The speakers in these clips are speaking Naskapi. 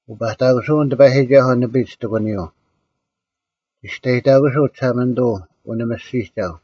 ᐅᐸᑕᑯᓯᐅᓐ ᑎᐸᔨᒋᒐᓱᐤ ᓂᐱᒡ ᑎᒂᓂᔪᐤ, ᒋᔅᑕᔨᑕᑯᓯᐤ ᒋᓴᒪᓂᑐᐤ ᐅᓂᒥᔅᒋᒐᐤ: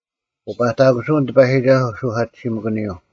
ᐅᐸᑕᑯᓱᐅᓐ ᑎᐸᔨᒋᒐᓱᐤ ᓱᐧᑲᑎᓯᒥᑭᓂᔪᐤ;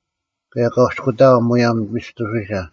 ᑭᔭ ᒂᔅᑯᑕᐊᐤ ᒧᔭᒻ ᒥᔅᑐᓯᓴ: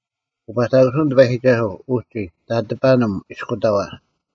ᐅᐸᑕᑯᓱᐅᓐ ᑎᐸᔨᒋᒐᓱᐤ ᐅᒋ ᑕᑎᐸᓂᒻ ᐃᔅᑯᑕᐛ᙮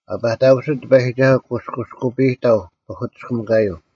ᐊ ᐸᑕᑯᓯᑦ ᑎᐸᔨᒋᒐᓱᐤ ᑯᔅᑯᔅᑯᐸᔨᑕᐤ ᐸᐧᑯᑎᔅᑭᒥᑯᔪᐤ;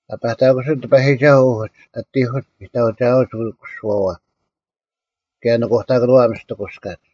ᐊ ᐸᑕᑯᓯᑦ ᑎᐸᔨᒋᒐᓱᐤ ᐅᒡ ᐊᑎᐧᑯᒡ ᓂᑕᐅᒋᐊᐅᒡ ᐅᑯᓱᐛᐛ, ᑭᔭ ᓄᑯᑕᑭᓄᐛ ᐊ ᒥᔅᑎᑯᔅᑲᒡ: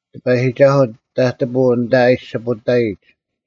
ᑎᐸᔨᒋᒐᓱᐤ ᑕᑎᐳᐤ ᐊᓐᑕ ᐊ ᐃᔅᒋᐳᑕᔨᒡ;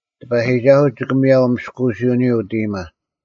ᑎᐸᔨᒋᒐᓱᐤ ᒋᑭ ᒥᔭᐤ ᒥᔅᑯᐅᓯᐅᓂᔪᐤ ᐅᑦ ᐃᔨᒪ;